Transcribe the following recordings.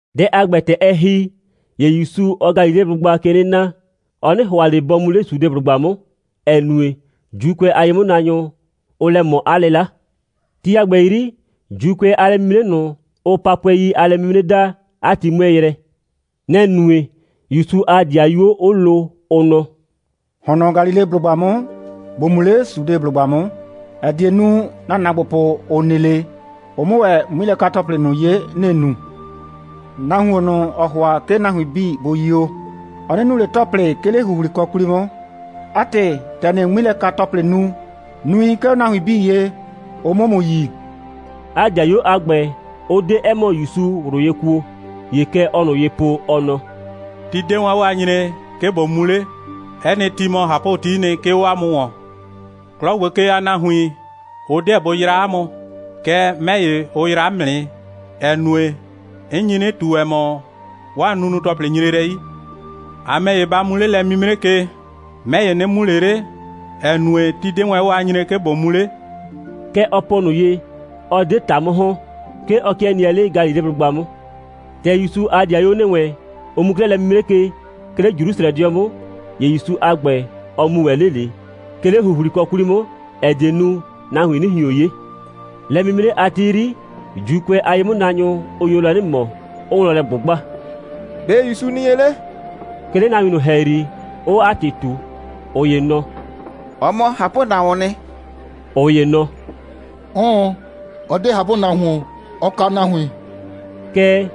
Dɛ a ‑gbɛ, ‑tɛ ɛ ‑hi, ‑ye ‑Yusu, ɔɔ Galileblʋgba ke 'nɩ na; ɔ 'nɩ ‑hʋa ꞊le bɔ mu 'le Sudeblʋgba 'mʋ, ‑ɛ nue, ‑Juukʋɛ a ye'mʋnaanyʋ, ʋʋ lɛ ꞊mɔ 'a 'lɩla. Ti a ‑gbɛ 'yri, ‑Juukʋɛ a lɛ'mimre ꞊nʋ, ʋʋ Papʋɛi a lɛ'mimre daa, 'a ti 'mʋɛɛ yrɛ. Nɛ‑ nue, ‑Yusu a ‑dɩayuo 'ʋ lo, ʋ nɔ: «‑Hɔn nɔ Galileblʋgba 'mʋ, ‑bo mu 'le Sudeblʋgba 'mʋ, ‑ɛ die nu, ‑na ‑naagbopʋ, ‑ʋ nɩ 'le, ʋ 'mʋ ‑wɛ 'ŋmilɛka‑tɔplɩ ꞊nʋ 'ye, ‑nɩɩ nu. Nahuon ꞊nʋ, ‑ɔɔ ‑hʋa, 'ke nahuin 'bii bʋ yio, ɔ 'nɩ nu ꞊le ‑tɔplɩ, 'ke 'le ‑huhlikɔ 'kwli 'mʋ. 'A ‑tɩ, ‑tɛ ‑nɩɩ 'ŋmilɛka‑tɔplɩ nu, nui 'ke 'o nahuin 'bii ye, ʋ 'mʋ ‑mʋ yi.» 'A ‑dɩayuo a ‑gbɛ, ʋ 'de 'ɛ ‑mɔ ‑Yusu ꞊wlʋ ye kuo. ‑Ye kɛ ɔɔ ꞊nʋ ye po, ɔ nɔ: «Ti 'de wɛn 'o a nyree, 'ke ꞊bo mu 'le. 'Ɛ nɩ ti mɔ ꞊hapʋtii nɩ, 'ke 'o 'a mʋ ‑wɔn. 'Klɔ ‑gbo ke a nahuin, ʋ 'deɛ bʋ yraa 'a mʋ, kɛɛ, 'mɛ ‑ye, ʋ yraa 'mʋ nɩ, ‑ɛ nue, 'n nyi 'nɩ ꞊tu, ‑ɛ mɔ, 'waa nunu‑tɔplɩ nyre lɛ 'yi. A ‑mɛ ‑ye, ba mu 'le lɛ'mimre ke. 'Mɛ ‑ye, 'nɩ mu ꞊le 'le, ‑ɛ nue, ti 'de wɛn 'o a nyree, 'ke ꞊bo mu 'le.» Kɛ ɔ po ꞊nʋ ye, 'ɔ 'de ‑ta 'mʋ ‑hɔn. 'Ke ɔ 'kɩɛ nɩɛ 'le Galileblʋgba 'mʋ. ‑Tɛ ‑Yusu a ‑dɩayuo ‑nɩ wɛn, ʋ mu 'klɛɛ lɛ'mimre ke, 'ke 'le Jrusrɛdɩɔ 'mʋ, ‑ye ‑Yusu a ‑gbɛ, ɔ mu ‑wɛ 'le ꞊le, 'ke 'le ‑huhlikɔ 'kwli 'mʋ, ‑ɛ die nu, nahuin 'nɩ ꞊hion 'ye. Lɛ'mimre a ti 'yri, ‑Juukʋɛ a ye'mʋnaanyʋ, ʋ nyo lɛ 'nɩ ꞊mɔ, 'ʋʋ wlɔn lɛ ꞊gbʋgba: «‑Be' ‑Yusu nɩ ye 'le?» 'ke 'le nahuin ꞊nʋ ‑hɛyri, 'ʋʋ 'a ‑tɩ ꞊tu. ꞊Ʋ ‑ye nɔ: «Ɔ mɔ ꞊hapʋnahuoon nɩ.» ꞊Ʋ ‑ye nɔ: «'Ʋʋn, ɔ 'de ꞊hapʋnahuon, ɔɔ kaa nahuin.» Kɛɛ,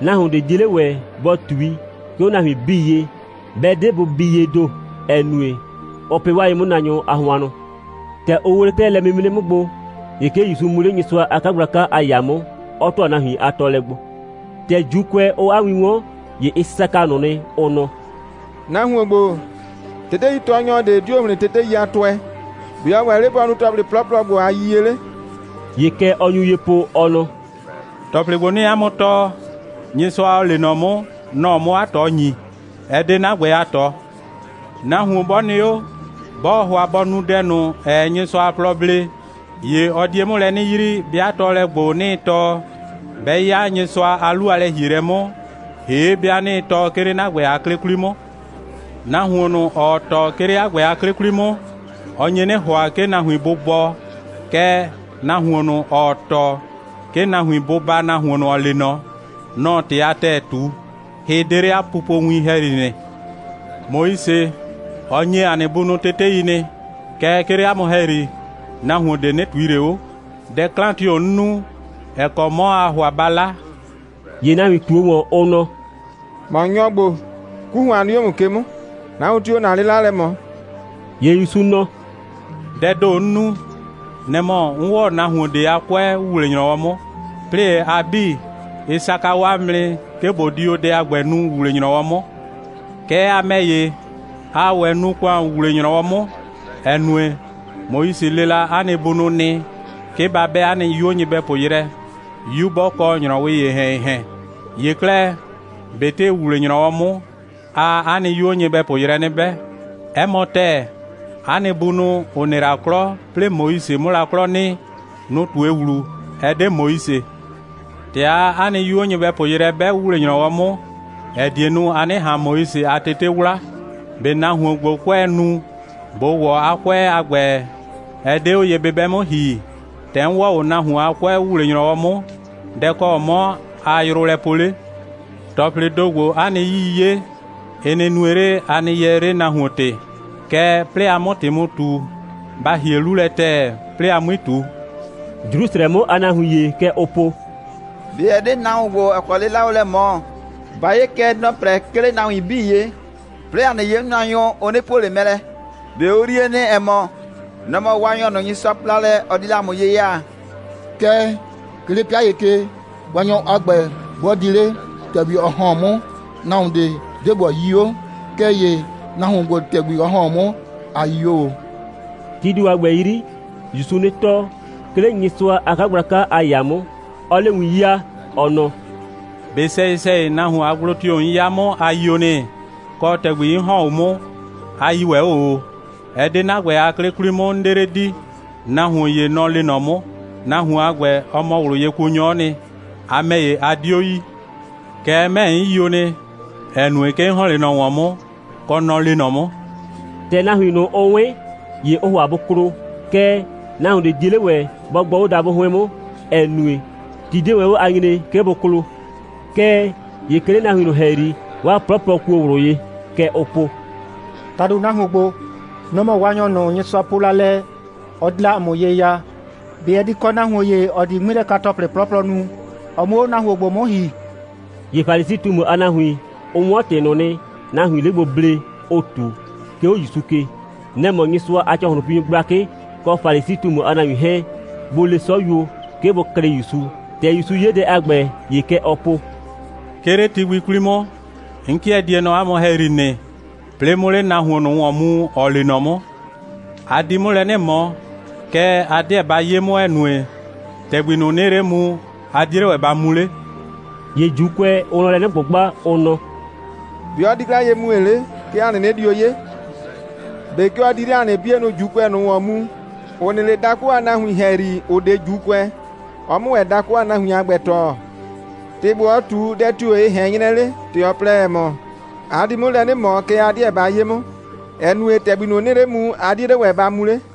nahuon ꞊de 'die 'le ‑wɛ bɔ ꞊tui, 'ke 'o nahuin 'bii ye, 'bɛ 'de bʋ bii yee ‑do, ‑ɛ nue, ʋʋ pɩ 'waa ye'mʋnaanyʋ a hʋannʋ. ‑Tɛ ʋ ‑wle 'klɛɛ lɛ'mimre 'mʋ gbo, ‑ye 'ke ‑Yusu mu 'le Nyɩsʋa a 'kagblaka a ‑yaa 'mʋ, 'ɔ ‑tʋa nahuin a tɔɔlɛ gbo. ‑Tɛ ‑Juukʋɛ, ʋʋ 'a win 'wɔn, ‑ye ɩ saka ꞊nʋ nɩ, ʋ nɔ: «Nahuon ‑gbo, teteitɔɔnyɔ ꞊de 'dio ‑hlɩn tetei a tʋɛ. ‑Be' ɔ ‑wɛ 'le bɔ nu ‑tɔplɩ 'plɔplɔdʋ ‑gbo a yiyie 'le?» ‑Ye kɛ ɔ nyu ye po, ɔ nɔ: «‑Tɔplɩ ‑gbo, 'nɩɩ 'a mʋ tɔɔ, Nyɩsʋa, ‑ɔ lee nɔ 'mʋ, nɔ‑ɔ 'mʋ 'a ꞊tɔ ‑nyi. Ɛ 'de 'na ‑gbɛ a ꞊tɔ. Nahuon 'bɔ nɩ 'o, 'bɔɔ ‑hʋa bɔ nu dɛ ꞊nʋ, ‑ɛɛ Nyɩsʋa a plɔ blee, ‑ye ɔ die 'mʋ lɛ 'nɩ yrii, 'bɩa tɔɔlɛ ‑gbo, 'nɩɩ tɔɔ, 'bɛ 'ya Nyɩsʋa a 'lu a lɛ‑hielɛ 'mʋ, ‑hee' 'bɩa 'nɩɩ tɔɔ, 'ke 'le 'na ‑gbɛ a 'klɩ 'kwli 'mʋ. Nahuon ꞊nʋ, ‑ɔɔ tɔɔ, 'ke 'le 'a ‑gbɛ a 'klɩ 'kwli 'mʋ, ɔ nye 'nɩ ‑hʋa, 'ke nahuin bʋ bɔɔ. Kɛɛ, nahuon ꞊nʋ, ‑ɔɔ tɔɔ, 'ke nahuin bʋ baa nahuon ꞊nʋ, ‑ɔ lee ꞊nɔ, nɔ‑ɔ ‑tɩ a ‑tɛɛ ꞊tu. Hɩ 'de 'le 'a pupowin ‑hɛyri nɩ. Moise, ɔ ‑nye 'a nɩ bunʋ tetei nɩ. Kɛɛ, 'ke 'le 'a mʋ ‑hɛyri, nahuon ꞊de 'nɩ ꞊tui ꞊le 'o. Dɛ 'klan tio‑ 'n nu, ‑ɛ kɔ 'mɔ aa ‑hʋa ba 'la?» ‑Ye nahuin ꞊tuo ‑wɔn, ʋ nɔ: «‑Mɔ nyɔ ‑gbo, 'ku ‑hʋan nɩ 'o ‑mʋ ke 'mʋ. Nahuon tio‑o ‑na 'lɩla lɛ ꞊mɔ?» ‑Ye ‑Yusu nɔ: «Dɛɛ ‑do, 'n nu, nɛ‑ mɔ, 'n ‑wɔ o nahuon ꞊de a 'kʋɛ ‑wuwle‑nyrɔwɔ 'mʋ. 'Plɩɩ ‑ye, a 'bii, ɩ saka o 'a mʋ nɩ, 'ke ꞊bo di o dɛ a ‑gbɛ nu ‑wuwle‑nyrɔwɔ 'mʋ. Kɛɛ, a ‑mɛ ‑ye, aa ‑wɛ nu ‑kʋan ‑wuwle‑nyrɔwɔ 'mʋ, ‑ɛ nue, Moise le la 'a nɩ bunʋ nɩ, 'ke ba 'bɛ 'a nɩ 'yuo nyɩbɛpʋ yrɛ, 'yu 'bɔ kɔ ‑nyrɔwɩɩ ‑yehɛn‑yehɛn. ‑Ye 'klɛɛ, ꞊betɩ ‑wuwle‑nyrɔwɔ 'mʋ, aa 'a nɩ 'yuo nyɩbɛpʋ yrɛ 'nɩ 'bɛ. 'Ɛ mɔ ‑tɛɛ, 'a nɩ bunʋ, ‑ʋ nɩ la 'klɔ, 'plɩɩ Moise 'mʋ la 'klɔ nɩ, nʋ‑ ꞊tue ‑wlu, ɛ 'de Moise. ‑Tɛ aa 'a nɩ 'yuo nyɩbɛpʋ yrɛ 'bɛ ‑wuwle‑nyrɔwɔ 'mʋ, ‑ɛ die nu, a 'nɩ ꞊han Moise a tete 'wla, ꞊be nahuon ‑gbo, 'kʋɛɛ nu, ‑bo ‑wɔ 'a 'kʋɛ a ‑gbɛ, ɛ 'de 'o ye'bɩbɛ 'mʋ ‑hi? ‑Tɛ 'n ‑wɔ o nahuon a 'kʋɛ ‑wuwle‑nyrɔwɔ 'mʋ, dɛ‑ kɔ 'mɔ aa yrʋ lɛ poo 'le? ‑Tɔplɩɩ ‑do ‑gbo, 'a nɩ 'yii 'ye, ɩ nɩ nue 'le, a nɩ yɛɛ 'le nahuon ‑tɩ. Kɛɛ, 'plɩɩ a 'mʋ ‑tɩ mu ꞊tu, ba ‑hie 'lu lɛ ‑tɛɛ, 'plɩɩ a 'mui ꞊tu.» Jrusrɛ 'mʋ a nahuin ‑ye, kɛ ʋʋ po: «꞊Be ɛ 'de nahuon ‑gbo, ‑ɔ kɔ 'lɩla ʋʋ lɛ ꞊mɔ? Ba 'ye kɛ, nɔ‑ɔ 'prɛ, 'ke 'le nahuin 'bii ye, 'plɩɩ ‑a nɩ ye'mʋnaanyʋ, ʋ 'nɩ puo ꞊le mɛ lɛ. ꞊Be ʋ yrie nɩ, ‑ɛ mɔ, nɔ‑ mɔ Waanyɔ ꞊nʋ, Nyɩsʋa po la lɛ, ɔ di la ‑a mʋ ye ya? Kɛɛ, 'ke 'le 'pɩa ‑ye ke, Waanyɔ a ‑gbɛ 'bɔ di 'le, ‑tɛgbi ɔ ‑hɔn 'o 'mʋ, nahuon ꞊de 'deɛ bɔ yii 'o. Kɛɛ ‑ye nahuon ‑gbo, ‑tɛgbi ɔ ‑hɔn 'o 'mʋ, ‑a yii 'o ꞊o.» Tii ‑do a ‑gbɛ 'yri, ‑Yusuu 'nɩ tɔɔ, 'ke 'le Nyɩsʋa a 'kagblaka a ‑yaa 'mʋ, 'ɔɔ 'le win 'yaa, ɔ nɔ: «꞊Be sɛyɩ‑sɛyɩ, nahuon a gblo tio‑ 'n 'ya 'mʋ, a yio nɩ? Kɔ, ‑tɛgbi 'n ‑hɔn 'o 'mʋ, a yii ‑wɛ 'o ꞊o? Ɛ 'de 'na ‑gbɛ a 'klɩ 'kwli 'mʋ, 'n 'de 'le di. Nahuon ‑ye, nɔ‑ lee nɔ 'mʋ. Nahuon a ‑gbɛ, ɔ mɔ ꞊wlʋyekuonyɔ'ɔ nɩ. A ‑mɛ ‑ye, a 'dio yi. Kɛɛ, 'mɛ ‑ye, 'n yio nɩ, ‑ɛ nue, 'ke 'n ‑hɔn 'le ꞊nɔ ‑wɔn 'mʋ, kɔ, nɔ‑ lee nɔ 'mʋ.» ‑Tɛ nahuin ꞊nʋ, ʋ 'wɩn, ‑ye ʋʋ ‑hʋa bʋ klo, kɛɛ, nahuon ꞊de 'die 'le ‑wɛ bɔ gbɔ 'o dabʋ 'hʋɩn 'mʋ, ‑ɛ nue, ti 'de wɛn 'o a nyree, 'ke bʋ klo. Kɛɛ ‑ye 'ke 'le nahuin ꞊nʋ ‑hɛyri, 'waa 'plɔplɔ kuo ꞊wlʋ ye. Kɛ ʋʋ po: «‑Tado, nahuon ‑gbo, nɔ‑ mɔ Waanyɔ ꞊nʋ, Nyɩsʋa po la lɛ, ɔ di la ‑a mʋ ye ya. ꞊Be ɛ di kɔ nahuon ‑ye, ‑ɔ di 'ŋmilɛka‑tɔplɩ 'plɔplɔ nu, ɔ 'mʋ 'o nahuon ‑gbo 'mʋ ‑hi?» ‑Ye Falisi꞊tumu a nahuin, ʋ 'wɔn ‑tɩ ꞊nʋ nɩ, nahuiin 'le gbo ble, ʋʋ ꞊tu, 'ke 'o ‑Yusu ke. Nɛ‑ mɔ Nyɩsʋa a ‑cɔhlʋnpinyʋ gblakɩ kɔ Falisi꞊tumu a nahuin 'hɛɛn, bʋ le 'sɔyuo, 'ke bʋ klɩ ‑Yusu. ‑Tɛ ‑Yusu 'ye dɛ a ‑gbɛ, ‑ye kɛ ɔɔ po: «'Ke 'le ti gbi 'kwli 'mʋ, 'n 'kɩɛ die nɔ 'a mʋ ‑hɛyri nɩ, 'plɩɩ 'mʋ 'le nahuon ꞊nʋ ‑wɔn mu, ‑ɔ lee nɔ 'mʋ. A di 'mʋ lɛ 'nɩ ꞊mɔ, kɛɛ, a 'deɛ ba 'ye 'mʋ, ‑ɛ nue, ‑tɛgbi ꞊nʋ, 'nɩɩ 'le mu, a 'die 'le ‑wɛ ba mu 'le.» ‑Ye ‑Juukʋɛ, ʋʋ wlɔn lɛ 'nɩ ꞊gbʋgba, ʋ nɔ: «‑Be' ɔ di 'klɛɛ ye mue 'le, 'ke ‑a 'nɩnɩ dio 'ye? ꞊Be 'ke ɔ di 'le ‑a nɩ 'bienʋ ‑Juukʋɛ ꞊nʋ ‑wɔn mu, ‑ʋ nɩ 'le dakʋ a nahuin ‑hɛyri, ‑ʋ 'de ‑Juukʋɛ, ɔ 'mʋ ‑wɛ dakʋ a nahuin a ‑gbɛ tɔɔ? ‑Tɩ ‑gbo, ɔ ꞊tu, dɛ tio‑ ɛ ꞊hɛn 'nyrɛ 'le, ‑tɛ ɔ plɛ, ‑ɛ mɔ: A di 'mʋ lɛ 'nɩ ꞊mɔ, kɛɛ, a 'deɛ ba 'ye 'mʋ, ‑ɛ nue, ‑tɛgbi ꞊nʋ, 'nɩɩ 'le mu, a 'die 'le ‑wɛ ba mu 'le.»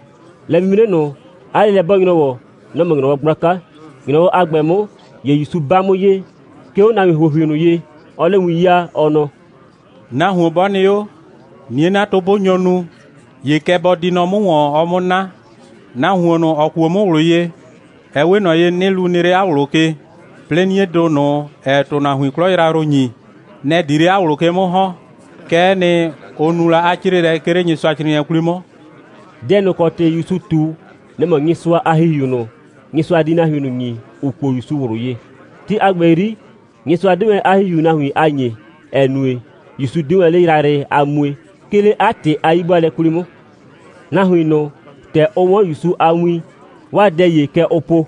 Lɛ'mimre ꞊nʋ, 'a 'lelɛ'bɔɔ‑nyrɔwɔ, nɔ‑ mɔ ‑nyrɔwɔ gblaka. ‑Nyrɔwɔ a ‑gbɛ 'mʋ, ‑ye ‑Yusu 'ba 'mʋ ye, 'ke 'o nahuin ‑huohui ꞊nʋ ye, 'ɔɔ 'le win 'yaa, ɔ nɔ: «Nahuon 'bɔ nɩ 'o, 'nie'natʋ 'bʋ nyo nu, ‑ye kɛ bɔ di nɔ 'mʋ ‑wɔn, ɔ 'mʋ 'na. Nahuon ꞊nʋ, ‑ɔ kuo 'mʋ ꞊wlʋ ye, ɛ 'we ꞊nɔ ye, 'nɩlu nɩ 'le 'a ꞊wlʋ ke, 'plɩɩ 'niedʋ ꞊nʋ, ‑ɛɛ ‑tʋnahuin 'klɔ yrayrʋ ‑nyi, nɛ‑ di 'le 'a ꞊wlʋ ke 'mʋ ‑hɔn. Kɛ'ɛ nɩ, ʋ nu la 'a 'crɩɩlɛ, 'ke 'le Nyɩsʋacrɩɩnɩɛ 'kwli 'mʋ.» Dɛ ꞊nʋ ‑kɔ ‑tɩ ‑Yusu ꞊tu, nɛ‑ mɔ Nyɩsʋa a ‑Hihiu ꞊nʋ, Nyɩsʋa di nahuin ꞊nʋ ‑nyi, ‑ʋ kuo ‑Yusu ꞊wlʋ ye. Ti a ‑gbɛ 'yri, Nyɩsʋa 'de wɛn 'a ‑Hihiu nahuin a ‑nyee, ‑ɛ nue, ‑Yusu 'de wɛn 'le yrayrɩ a mue, 'ke 'le 'a ‑tɩ a 'yi'bʋaalɛ 'kwli 'mʋ. Nahuin ꞊nʋ, ‑tɛ ʋ 'wɔn ‑Yusu a win, 'waa dɛ ‑ye, kɛ ʋʋ po: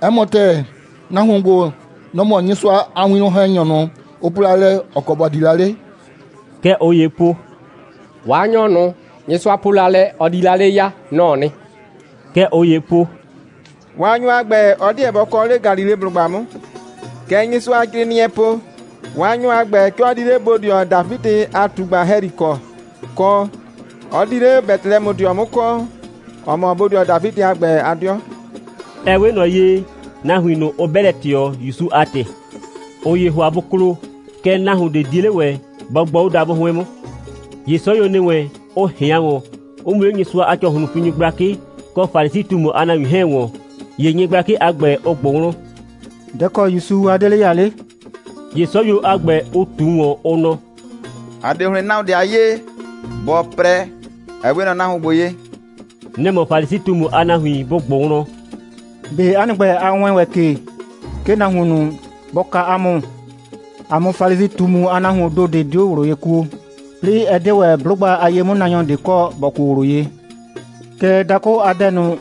«'Ɛ mɔ ‑tɛɛ, nahuon ‑gbo, nɔ‑ mɔ Nyɩsʋa a winwlɔn‑hɛnyɔ ꞊nʋ, ʋ po la lɛ, ‑ɔ kɔ ‑bɔ di la 'le.» Kɛ ꞊ʋ ‑yee po: «Waanyɔ ꞊nʋ, Nyɩsʋa po la lɛ, ɔ di la 'le ya, nɔ‑ɔ nɩ.» Kɛ ꞊ʋ ‑yee po: «Waanyɔ a ‑gbɛ, ɔ 'deɛ bɔ kɔ 'le Galileblʋgba 'mʋ. Kɛ Nyɩsʋacrɩɩnɩɛɛ po: Waanyɔ a ‑gbɛ, 'ke ɔ di 'le bodɩɔ Dafidɩ a ꞊tugba ‑hɛyri kɔ, kɔ, 'ɔ di 'le Betelɛmʋdɩɔ 'mʋ kɔ, ‑ɔ mɔ Dafidɩ a ‑gbɛ a 'dɩɔ.» Ɛ 'we ꞊nɔ ye, nahuin ꞊nʋ, ʋ 'bɛ lɛ ꞊tɩɔ, ‑Yusu a ‑tɩ. ꞊Ʋ ‑yee ‑hʋa bʋ klo, kɛɛ, nahuon ꞊de 'die 'le ‑wɛ bɔ gbɔ 'o dabʋ 'hʋɩn 'mʋ. ‑Ye 'sɔyuo ‑nɩ wɛn, ʋ ꞊hɩan ‑wɔn, 'ʋ mu 'le Nyɩsʋa a ‑cɔhlʋnpinyʋ gblakɩ kɔ Falisi꞊tumu a nahuin 'hɛɛn ‑wɔn. ‑Ye nyɩgblakɩ a ‑gbɛ, ʋ ꞊gbʋ wlɔn: «Dɛ‑ kɔ ‑Yusu a 'de 'le ya 'le?» ‑Ye 'sɔyuo a ‑gbɛ, ʋ ꞊tu ‑wɔn, ʋ nɔ: «‑A 'de ‑hlɩn nahuon ꞊de a 'yee, ‑bɔ 'prɛ, ‑ɛ 'we ꞊nɔ nahuon ‑gbo ye.» Nɛ‑ mɔ Falisi꞊tumu a nahuin bʋ ꞊gbʋ wlɔn: «꞊Be 'a nɩ ‑gbɛ, a wɛɛn ‑wɛ ke, 'ke nahuon ꞊nʋ bɔ kaa 'a mʋ. ‑A mʋ Falisi꞊tumu a nahuoon ‑do ꞊de 'dio ꞊wlʋ ye kuo, 'plɩɩ ɛ 'de ‑wɛ 'blʋgba a ye'mʋnaanyɔ ꞊de kɔ, ‑bɔ kuo ꞊wlʋ ye. Kɛɛ, dakʋ a dɛ ꞊nʋ,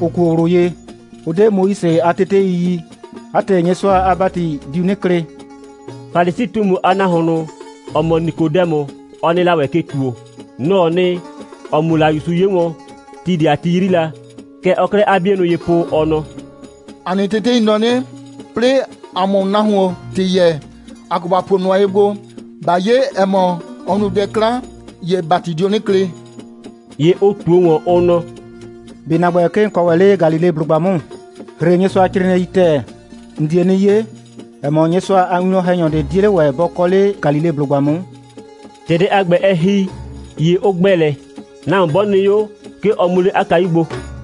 ‑ʋ kuo ꞊wlʋ ye, ʋ 'de Moise a tetei yi. 'A ‑tɩ, Nyɩsʋa a ‑bati diu 'nɩ klɩ.» Falisi꞊tumu a nahuon ꞊nʋ, ‑ɔ mɔ Nikodɛmʋ, ɔ nɩ la ‑wɛ ke ‑tuo. Nɔ‑ɔ nɩ, ‑ɔ mu la ‑Yusu 'ye wɔn, ti ꞊de a ti 'yri la. Kɛ ɔɔ 'klɛɛ 'a 'bienʋ ye po, ɔ nɔ: «‑A nɩ tetei nɔ 'nɩ: 'Plɩɩ ‑a 'mʋ nahuon ‑tɩ yɛɛ, ‑a kɔ ‑ba puo nʋa ye gbo. ꞊Ba 'ye, ‑ɛ mɔ, ɔ nu dɛ 'klan, ‑ye ‑bati dio 'nɩ klɩ.» ‑Ye ʋ ꞊tuo ‑wɔn, ʋ nɔ: «꞊Be ‑na ‑gbɛ, 'ke ‑n kɔ ‑wɛ 'le Galileblʋgba 'mʋ? ‑Hre Nyɩsʋacrɩɩnɩɛi ‑tɛɛ. ‑N die 'nɩ 'ye, ‑ɛ mɔ, Nyɩsʋa a winwlɔn‑hɛnyɔ ꞊de 'die 'le ‑wɛ bɔ kɔ 'le Galileblʋgba 'mʋ.» [ ‑Tɛ dɛ a ‑gbɛ, ɛ ‑hi, ‑ye ʋ ‑gbɛ lɛ. Nahuon 'bɔ nɩ 'o, 'ke ɔ mu 'le 'a kayu gbo.